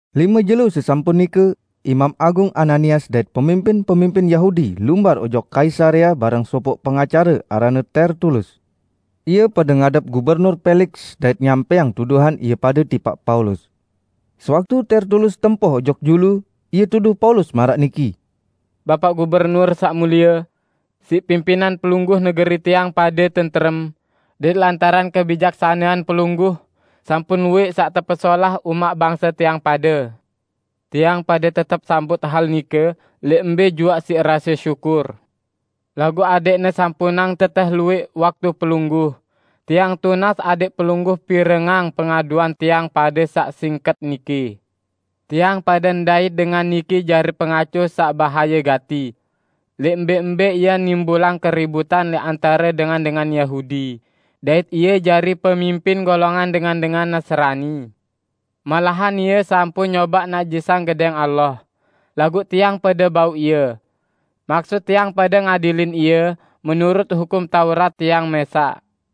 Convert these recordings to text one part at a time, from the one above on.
Lime jelo sesampun nike, Imam Agung Ananias dait pemimpin-pemimpin Yahudi lumbar ojok Kaisarea bareng sopoq pengacare aranne Tertulus. Ie pade ngadep Gubernur Peliks dait nyampẽang tuduhan ie pade tipaq Paulus. Sewaktu Tertulus tempoh ojok julu, ie tuduh Paulus maraq niki, "Bapaq Gubernur Saq Mulie! Siq pimpinan pelungguh negeri tiang pade tentrem. Dait lantaran kebijaksanean pelungguh sampun luwẽq saq tepesolah umaq bangse tiang pade. Tiang pade tetep sambut hal nike lẽq mbẽ juaq siq rase syukur. Laguq adẽqne sampunang tetẽh luwẽq waktu pelungguh, tiang tunas adẽq pelungguh pirengang pengaduan tiang pade saq singket niki. Tiang pade ndait dengan niki jari pengaco saq bahaye gati. Lẽq mbẽ-mbẽ ie nimbulang keributan lẽq antare dengan-dengan Yahudi, dait ie jari pemimpin golongan dengan-dengan Nasrani. Malahan ie sampun nyobaq najisang Gedẽng Allah, laguq tiang pade bau ie. [Maksut tiang pade ngadilin ie menurut Hukum Taurat tiang mẽsaq.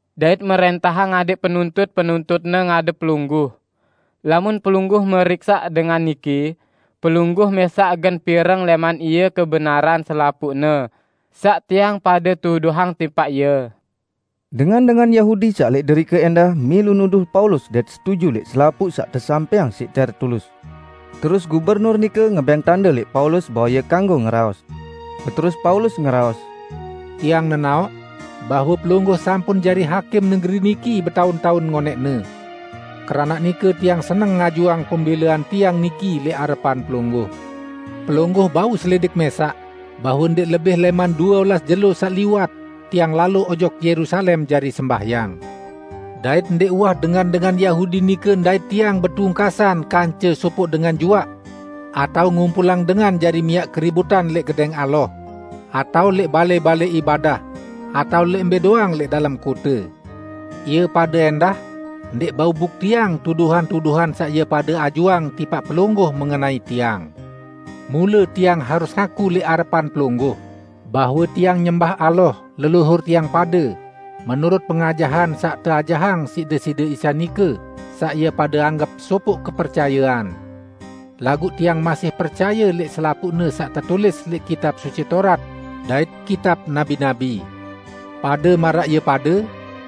dait mrẽntahang adẽq penuntut-penuntutne ngadep pelungguh.] Lamun pelungguh meriksaq dengan niki, pelungguh mẽsaq gen pireng lẽman ie kebenaran selapuqne saq tiang pade tuduhang tipaq ie." Dengan-dengan Yahudi saq lẽq derike ẽndah milu nuduh Paulus dait setuju lẽq selapuq saq tesampẽang siq Tertulus. Terus Gubernur nike ngebẽng tande lẽq Paulus bahwe ie kanggo ngeraos. Beterus Paulus ngeraos, "Tiang nenaoq bahwe pelungguh sampun jari hakim negeri niki betaun-taun ngonẽqne. Keranaq nike tiang seneng ngajuang pembẽlean tiang niki lẽq arepan pelungguh. Pelungguh bau selidik mẽsaq bahwe ndẽq lebih lẽman due olas jelo saq liwat tiang lalo ojok Yerusalem jari sembahyang. Dait ndẽq uwah dengan-dengan Yahudi nike ndait tiang betungkasan kance sopoq dengan juaq atao ngumpulang dengan jari miaq keributan lẽq Gedẽng Allah atao lẽq balẽ-balẽ ibadah atao lẽq mbẽ doang lẽq dalem kote. Ie pade ẽndah ndẽq bau buktiang tuduhan-tuduhan saq ie pade ajuang tipaq pelungguh mengenai tiang. Mule tiang harus ngaku lẽq arepan pelungguh bahwe tiang nyembah Allah leluhur tiang pade menurut pengajahan saq teajahang siq Deside Isa nike saq ie pade anggep sopoq kepercayean. Laguq tiang masih percaye lẽq selapuqne saq tetulis lẽq Kitab Suci Taurat dait Kitab Nabi-nabi. Pade maraq ie pade,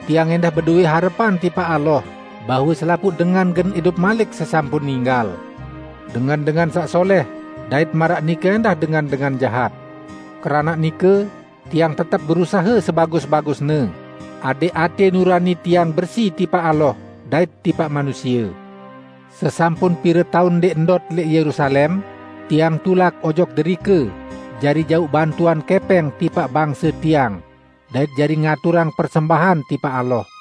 tiang ẽndah bedowẽ harepan tipaq Allah bahwe selapuq dengan gen idup malik sesampun ninggal -- dengan-dengan saq solẽh dait maraq nike ẽndah dengan-dengan jahat! Keranaq nike tiang tetep berusahe sebagus-bagusne, adẽq atẽ nurani tiang bersi tipaq Allah dait tipaq manusie. Sesampun pire taun ndẽq ndot lẽq Yerusalem, tiang tulak ojok derike jari jauq bantuan kẽpẽng tipaq bangse tiang dait jari ngaturang persembahan tipaq Allah.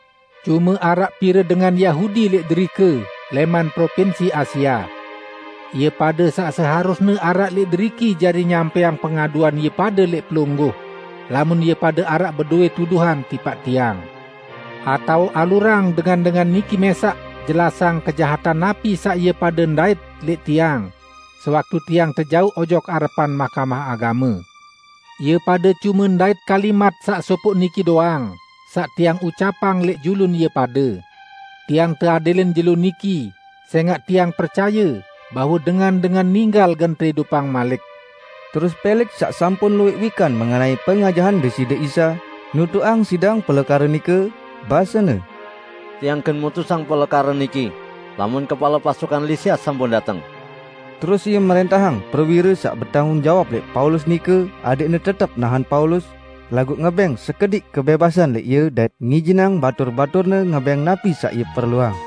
Cume araq pire dengan Yahudi lẽq derike lẽman Propinsi Asia. Ie pade saq seharusne araq lẽq deriki jari nyampẽang pengaduan ie pade lẽq pelungguh, lamun ie pade araq bedowẽ tuduhan tipaq tiang. Atao alurang dengan-dengan niki mẽsaq jelasang kejahatan napi saq ie pade ndait lẽq tiang sewaktu tiang tejauq ojok arepan Mahkamah Agame. Ie pade cume ndait kalimat saq sopoq niki doang saq tiang ucapang lẽq julun ie pade: Tiang teadilin jelo niki sẽngaq tiang percaye bahwe dengan-dengan ninggal gen teidupang malik." Terus Peliks saq sampun luwẽq wikan mengenai pengajahan Deside Isa, nutuqang sidang pelekare nike, basene, "Tiang gen mutusang pelekare niki, lamun kepale pasukan Lisias sampun dateng." Terus ie mrẽntahang prewire saq betanggung jawab lẽq Paulus nike adẽqne tetep nahen Paulus, laguq ngebẽng sekediq kebẽbasan lẽq ie dait ngijinang batur-baturne ngebẽng napi saq ie perluang.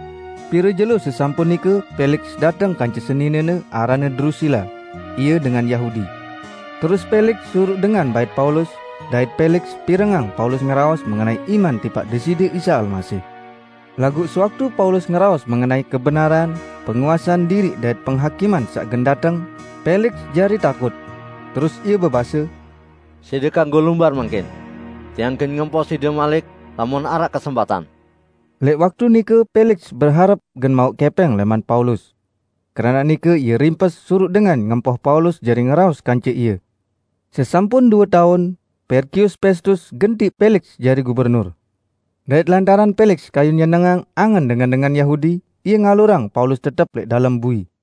Pire jelo sesampun nike Peliks dateng kance seninene aranne Drusila; ie dengan Yahudi. Terus Peliks suruq dengan bait Paulus, dait Peliks pirengang Paulus ngeraos mengenai iman tipaq Deside Isa Almasih. Laguq sewaktu Paulus ngeraos mengenai kebenaran, penguasean diriq dait penghakiman saq gen dateng, Peliks jari takut. Terus ie bebase, "Side kanggo lumbar mangkin. Tiang gen ngempoh side malik lamun araq kesempatan." Lẽq waktu nike Peliks beharep gen mauq kẽpẽng lẽman Paulus. Keranaq nike ie rimpes suruq dengan ngempoh Paulus jari ngeraos kance ie. Sesampun due taun, Perkius Pestus gentiq Peliks jari gubernur. Dait lantaran Peliks kayun nyenengang angen dengan-dengan Yahudi, ie ngalurang Paulus tetep lẽq dalem bui.